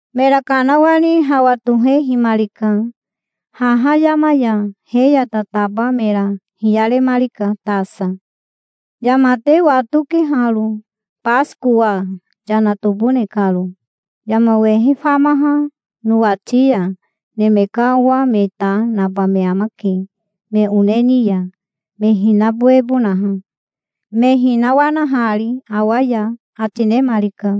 Mera kanawani hawa tohehimarika haha yama ya. He ya tataba mera hiyaremarika tasa. "Yama te watoke haro, Basikowa yana tobone karo yama wehe famaha nowati ya. Neme ka Owa me ta naba me amake me one ni ya, me hinabowebonaha, me hinawanahari awa ya", ati nemarika.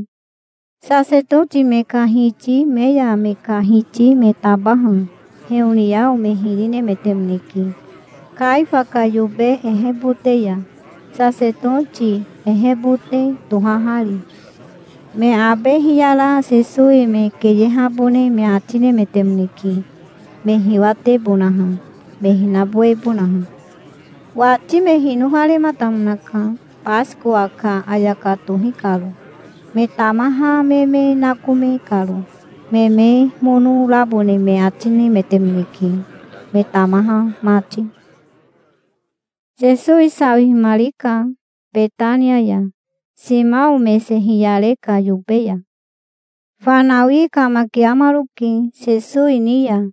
Sasetoti me ka hiti me ya me ka hiti me tabaha heoniao me hiri nemetemoneke Kaifa ka yobe ehebote ya, sasetoti ehebote tohahari. Me abe hiyara Sesowi me keyehabone me ati nemetemoneke, me hiwatebonaha, me hinabowebonaha. Wati me hinofarematamonaka Basikowa ka ayaka tohi karo, me tamaha me me nakome karo. Me me mono rabone me ati nemetemoneke, me tamaha mati. Sesowi sawihimarika Betania ya, Simao mese hiyare ka yobe ya. Fanawi kamakiamaroke Sesowi ni ya,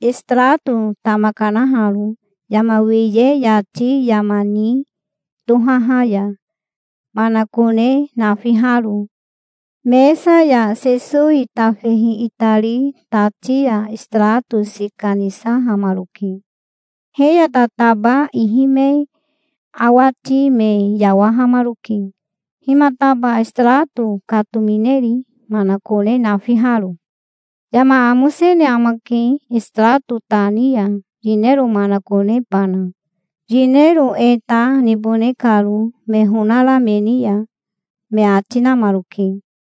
esitarato tama kanaharo yama wiye yati yama ni tohaha ya, manakone nafiharo. Mesa ya Sesowi tafehi itari tati ya esitarato sika nisahamaroke. He ya tataba ihi me awati me yawahamaroke. "Himataba esitarato katomineri, manakone nafiharo? Yama amosene amake, esitarato ta ni ya, yinero manakonebana, yinero e ta nibone karo me honara me ni ya", me ati namaroke.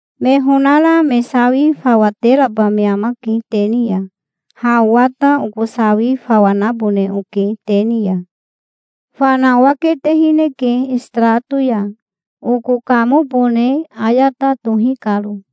Me honara me sawi fawa teraba me amake te ni ya. Ha owa ta oko sawi fawa nabone oke te ni ya. Fana owa ketehineke esitarato ya, oko kamobone ayata tohi karo.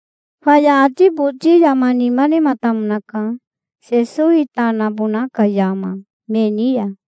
Faya ati boti yama nima nematamonaka, Sesowi ta nabona ka yama, me ni ya.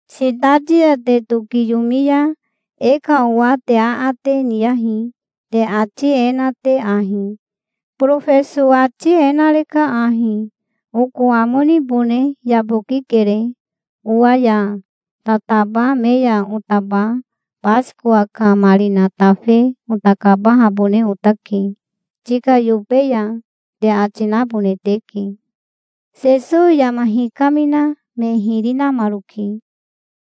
"Sitati ya te tokiyomi ya e ka owa te aate niyahi, te ati e na te ahi: 'Borofeso ati e nareka ahi: Oko amo nibone yabokikere. Owa ya tataba me ya otaba Basikowa ka marina tafe ota kabahabone otake tika yobe ya', te ati nabone teke". Sesowi yama hikamina me hiri namaroke,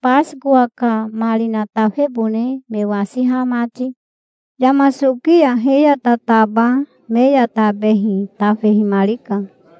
Basikowa ka marina tafebone me wasiha mati. Yama soki ya he ya tataba me ya tabehi tafehimarika.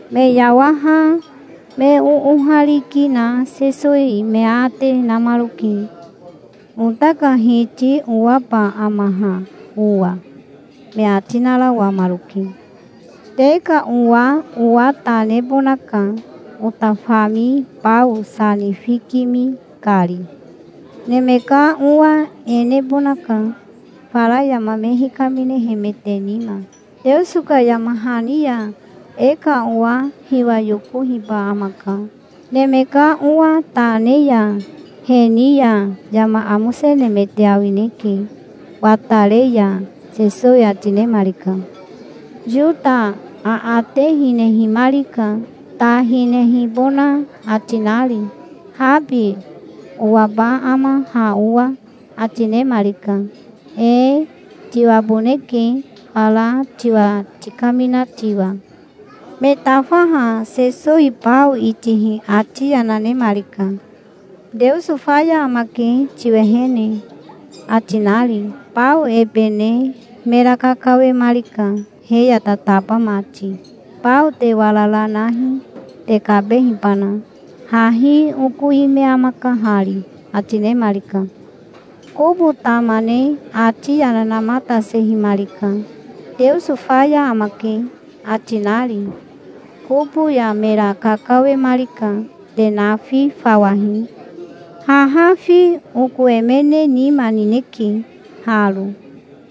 Me yawaha me oohariki na Sesowi me aate namaroke. "Ota ka Hiti owaba ama ha owa?" me ati narawamaroke. "Te ka owa owa ta nebonaka, ota fami bao sa nifikimi kari. Neme ka Owa e nebonaka, fara yama me hikaminehemete nima, Teoso ka yama hani ya. E ka owa hiwa yokohiba amaka, Neme ka Owa ta ne ya. He ni ya yama amosenemete awineke, watare ya", Sesowi ati nemarika. Yota aate hinehimarika, ta hinehibona ati nari. "Habi owaba ama ha owa?" ati nemarika. "Ee, tiwaboneke, fara tiwa tikamina tiwa". Me tafaha Sesowi bao itihi ati yana nemarika, "Teoso faya amake tiwehene", ati nari. Bao ebe ne mera kakawemarika he ya tataba mati. "Bao te warara nahi, te kabehibana. Hahi oko ime amaka hari", ati nemarika. Kobo tama ne ati yana namatasehimarika, "Teoso faya amake", ati nari. Kobo ya mera kakawemarika. "Te nafi fawahi. Haha fi oko emene nima nineke haro.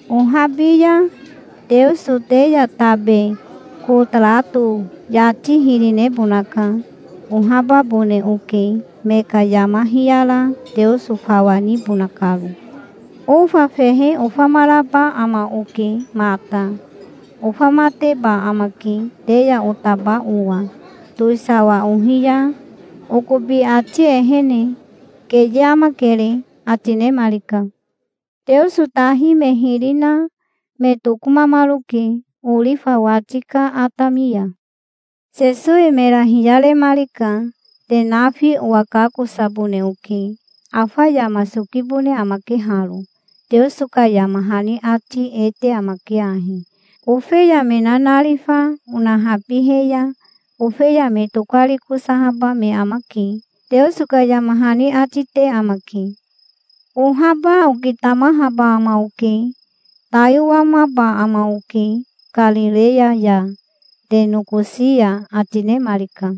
Ohabi ya Teoso te ya tabe kotarato yati hiri nebonaka. Ohababone oke, me ka yama hiyara Teoso fawa nibona karo. Ofa fehe ofamaraba ama oke mata. Ofamateba amake, te ya otaba owa, towisawa ohi ya, okobi ati ehene. Keye amakere", ati nemarika. Teoso tahi me hiri na me tokomamaroke orifa wati ka atami ya. Sesowi mera hiyaremarika. "Te nafi owa kakosabone oke. Afa yama sokibone amake haro. Teoso ka yama hani ati e te amake ahi: 'Ofeya me nanarifa onahabihe ya ofeya me tokarikosahaba me amake', Teoso ka yama hani ati te amake. Ohaba okitamahaba ama oke. Tai owamaba ama oke Karireya ya, te nokosi ya", ati nemarika.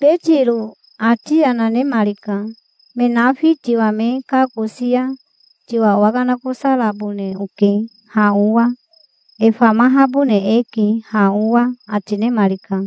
Betiro ati yana nemarika. "Me nafi tiwa me kakosi ya tiwa owakanakosarabone oke, ha owa. E famahabone eke, ha owa", ati nemarika.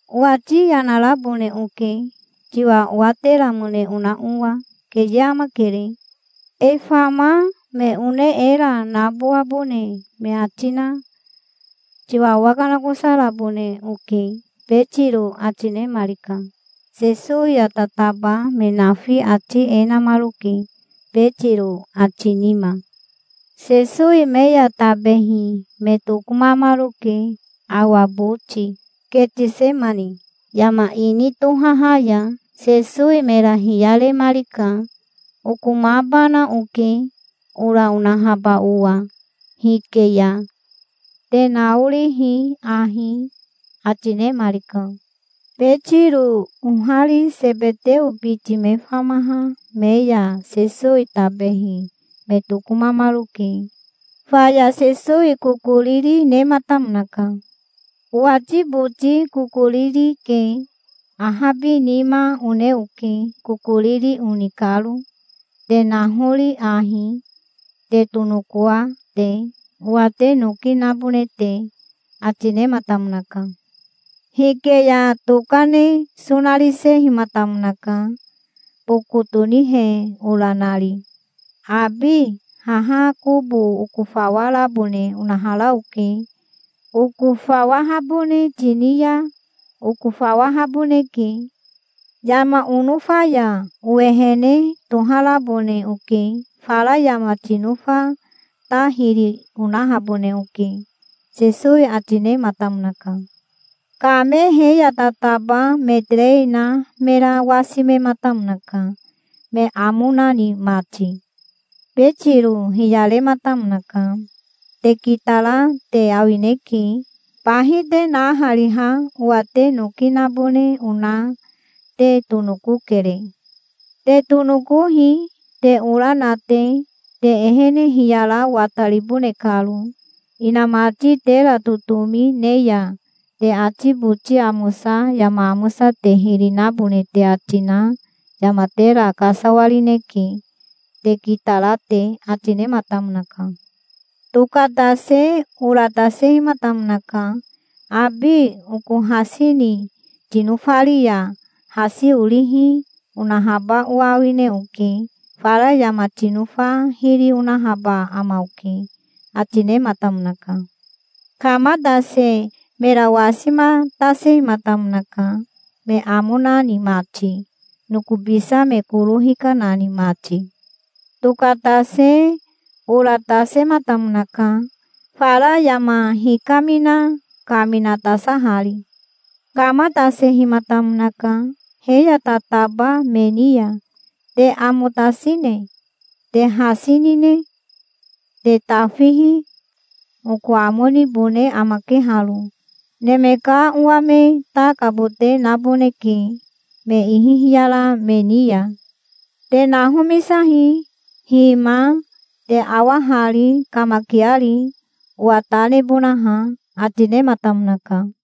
"Owati yana rabone oke, tiwa owateramone ona owa. Keye amakere. E fama me one era nabowabone me ati na tiwa owakanakosarabone oke", Betiro ati nemarika. Sesowi ya tataba me nafi ati e namaroke, Betiro ati nima. Sesowi me ya tabehi me tokomamaroke awa boti Ketisemani yama ini tohaha ya. Sesowi mera hiyaremarika. "Okomabana oke, ora onahaba owa hike ya. Te naorihi ahi", ati nemarika. Betiro ohari Sebeteo biti me famaha me ya Sesowi tabehi me tokomamaroke. Faya Sesowi kokoriri nematamonaka. "Owati boti kokoriri ke. Ahabinima one oke, kokoriri oni karo. Te nahori ahi, te tonokoa te, owa te noki nabone te", ati nematamonaka. Hike ya toka ne sonarisehimatamonaka, boko tonihe ora nari. "Abi haha kobo okofawarabone onahara oke. Okofawahabone tini ya okofawahaboneke. Yama onofa ya owehene toharabone oke. Fara yama tinofa ta hiri onahabone oke", Sesowi ati nematamonaka. Kame he ya tataba me terei na mera wasimematamonaka, me amo nani mati. Betiro hiyarematamonaka. "Te kitara te awineke. Bahi te nahariha owa te noki nabone ona te tonokokere. Te tonokohi, te ora na te, te ehene hiyara wataribone karo, inamati tera totomi ne ya. Te ati boti amosa yama amosa te hiri nabone te ati na yama tera kasawarineke, te kitara te", ati nematamonaka. Tokatase ora tasehimatamonaka. "Abi oko hasi ni tinofari ya hasi orihi onahaba owa awine oke. Fara yama tinofa hiri onahaba ama oke", ati nematamonaka. Kamatase mera wasimatasehimatamonaka, me amo nani mati, nokobisa me koro hikanani mati. Tokatase ora tasematamonaka, fara yama hikamina kaminatasahari. Kamatasehimatamonaka he ya tataba me ni ya. "Te amo tasine? Te hasi nine? Te tafihi. Oko amo nibone amake haro. Neme ka Owa me ta kabote naboneke me ihi hiyara me ni ya. Te nahomisahi. Hima, te awa hari, kamakiari, owa ta nebonaha", ati nematamonaka.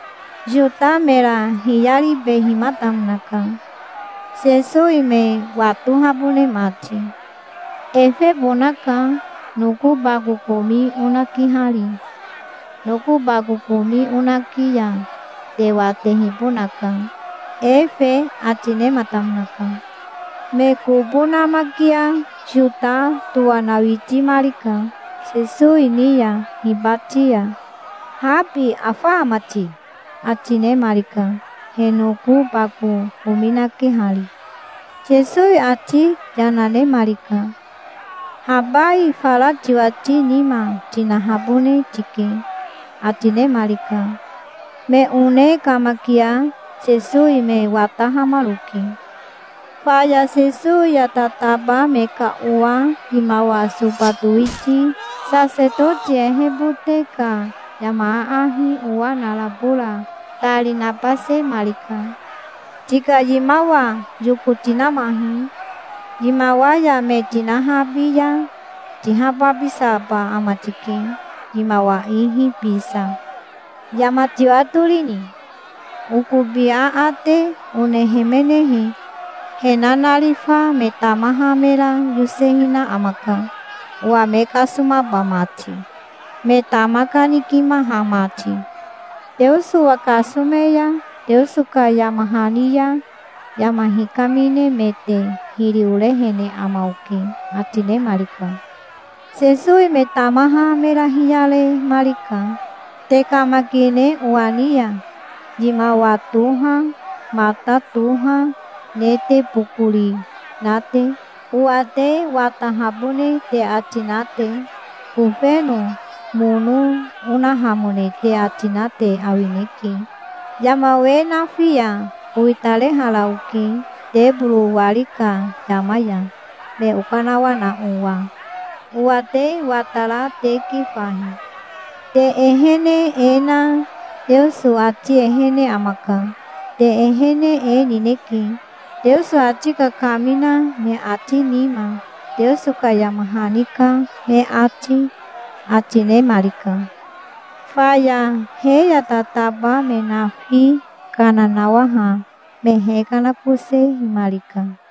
Yota mera hiyaribehimatamonaka, Sesowi me watohabone mati. "Efebonaka, noko bako komi onakihari. Noko bako komi onaki ya te watehibonaka, efe", ati nematamonaka. Me kobo namakia Yota towanawitimarika Sesowi ni ya, hibati ya. "Habi afa ama ti?" ati nemarika, he noko bako komi nakehari. Sesowi ati yana nemarika. "Habai fara tiwati nima tinahabone tike", ati nemarika. Me one kamakia Sesowi me watahamaroke. Faya Sesowi ya tataba me ka owa yimawa soba towiti sasetoti ehebote ka yama aahi owa narabo ra tari nabasemarika. "Tika yimawa yoko tinamahi. Yimawa ya me tinahabi ya tihababisaba ama tike, yimawa ihi bisa. Yama tiwatorini? Okobi aate onehemenehe, he nanarifa me tamaha mera yosehina amaka, owa me kasomaba mati, me tama kanikimaha mati. Teoso owa kasome ya Teoso ka yama hani ya yama hikaminemete hiri orehene ama oke", ati nemarika. Sesowi me tamaha mera hiyaremarika. "Te kamakine owa ni ya, yimawa toha, mata toha ne te bokori na te, owa te watahabone te ati na te? Kofeno mono onahamone te ati na te awineke. Yama we nafi ya owitarehara oke teboro wari ka yama ya, me okanawana owa. Owa te watara teke fahi. Te ehene e na Teoso ati ehene amaka. Te ehene e nineke, Teoso ati kakamina me ati nima, Teoso ka yama hani ka me ati", ati nemarika. Faya he ya tataba me nafi kana nawaha me hekanakosehimarika.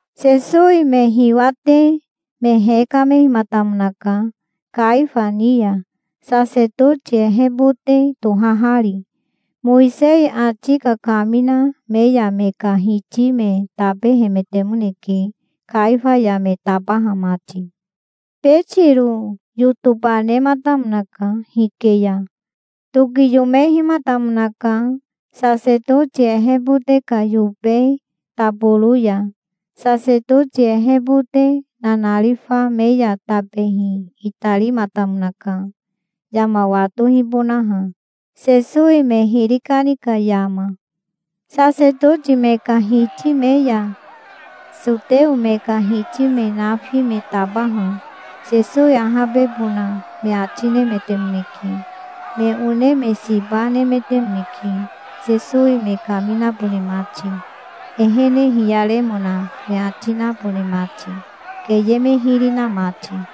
Sesowi me hiwate me hekamehimatamonaka Kaifa ni ya, sasetoti ehebote tohahari. Mowisei ati kakamina me ya me ka hiti me tabehemetemoneke, Kaifa ya me tabaha mati. Betiro yotoba nematamonaka hike ya. Tokiyomehimatamonaka sasetoti ehebote ka yobe taboro ya. Sasetoti ehebote nanarifa me ya tabehi itarimatamonaka, yama watohibonaha, Sesowi me hiri kani ka yama. Sasetoti me ka hiti me ya soteo me ka hiti me nafi me tabaha Sesowi ahabebona me ati nemetemoneke. Me one me siba nemetemoneke, Sesowi me kaminabone mati, ehene hiyaremona me ati nabone mati, keye me hiri na mati.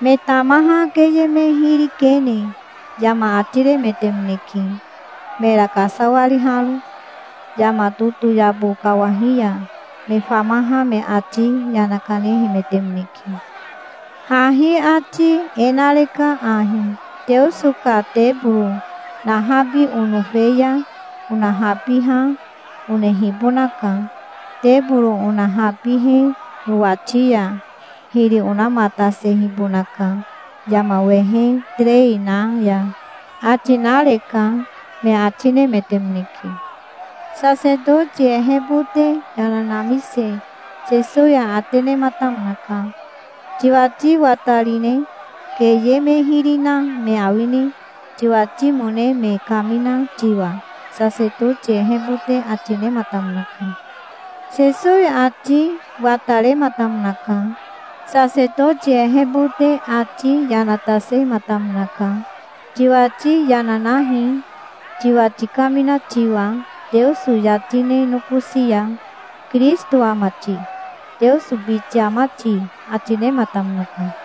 Me tamaha keye me hiri kene yama ati remetemoneke, mera kasawariharo. Yama totoyabo kawahi ya me famaha me ati yana kanehemetemoneke. "Hahi ati e nareka ahi: 'Teoso ka teboro nahabi onofe ya onahabiha onehibonaka. Teboro onahabihe nowati ya hiri onamatasehibonaka yama wehe terei na ya', ati nareka", me ati nemetemoneke. Sasetoti ehebote yana namise Sesowi aate nematamonaka. "Tiwati watarine? Keye me hiri na me awine, tiwatimone me kamina tiwa?" sasetoti ehebote ati nematamonaka. Sesowi ati watarematamonaka. Sasetoti ehebote ati yana tasehimatamonaka. "Tiwati yana nahi, tiwa tikamina tiwa, Teoso yati ne nokosi ya. Kirisito ama ti? Teoso biti ama ti?" ati nematamonaka.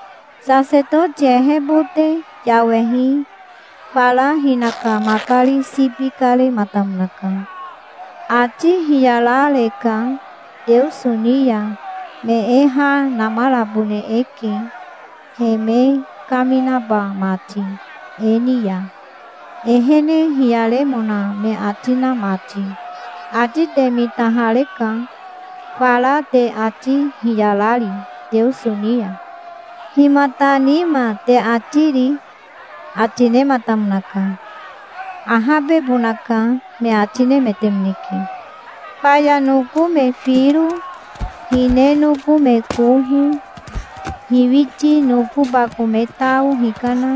Sasetoti ehebote yawehi fara hinaka makari sibi karematamonaka. "Ati hiyarareka Teoso ni ya. Me e ha namarabone eke, he me kaminaba mati e ni ya, ehene hiyaremona me ati na mati. Ati te mitahareka fara te, ati hiyarari Teoso ni ya. Himata nima te ati ri?" ati nematamonaka. "Ahabebonaka", me ati nemetemoneke. Faya noko me firo hine noko me koho hiwiti noko bako me tao hikana,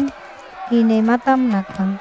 hinematamonaka.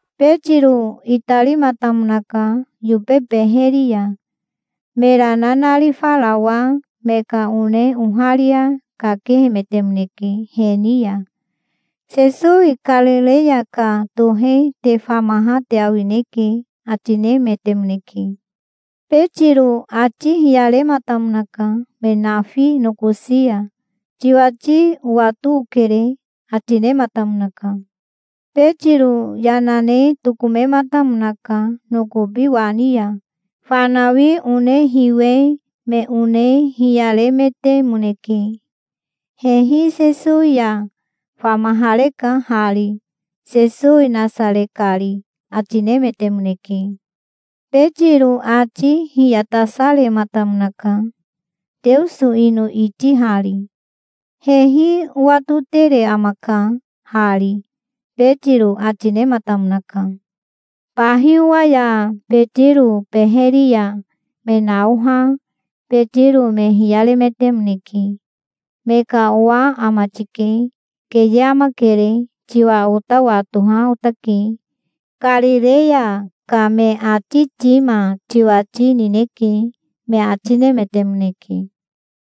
Betiro itarimatamonaka yobe beheri ya. Mera nanarifarawa me ka one oharia kakehemetemoneke he ni ya. "Sesowi Karireya ka tohe te famaha te awineke", ati nemetemoneke. Betiro ati hiyarematamonaka me nafi nokosi ya. "Tiwati owato okere", ati nematamonaka. Betiro yana ne tokomematamonaka nokobi wani ya. Fanawi one hiwe me one hiyaremetemoneke. "Hehi Sesowi ya famahareka hari, Sesowi Nasare kari", ati nemetemoneke. Betiro ati hiyatasarematamonaka, Teoso ino itihari. "Hehi owatotere amaka hari", Betiro ati nematamonaka. Bahi owa ya Betiro beheri ya me naoha Betiro me hiyaremetemoneke. "Me ka owa ama tike. Keye amakere. Tiwa ota watoha otake. Karireya ka me ati tima tiwati nineke", me ati nemetemoneke.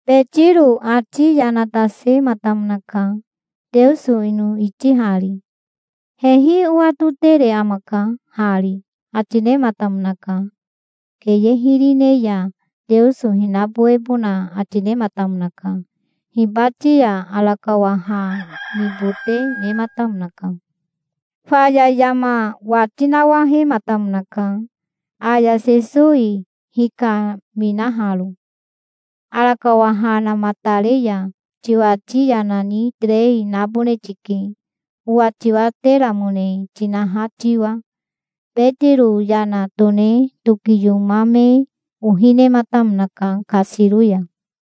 Betiro ati yana tasematamonaka, Teoso ino itihari. "Hehi owatotere amaka hari", ati nematamonaka. Keye hiri ne ya Teoso hinabowebona ati nematamonaka. Hibati ya arakawa ha nibote nematamonaka. Faya yama wati nawahematamonaka, aya Sesowi hikaminaharo. "Arakawa ha namatare ya tiwati yana ni terei nabone tike, owa tiwateramone tinaha tiwa". Betiro yana tone tokiyomame ohi nematamonaka kasiro ya.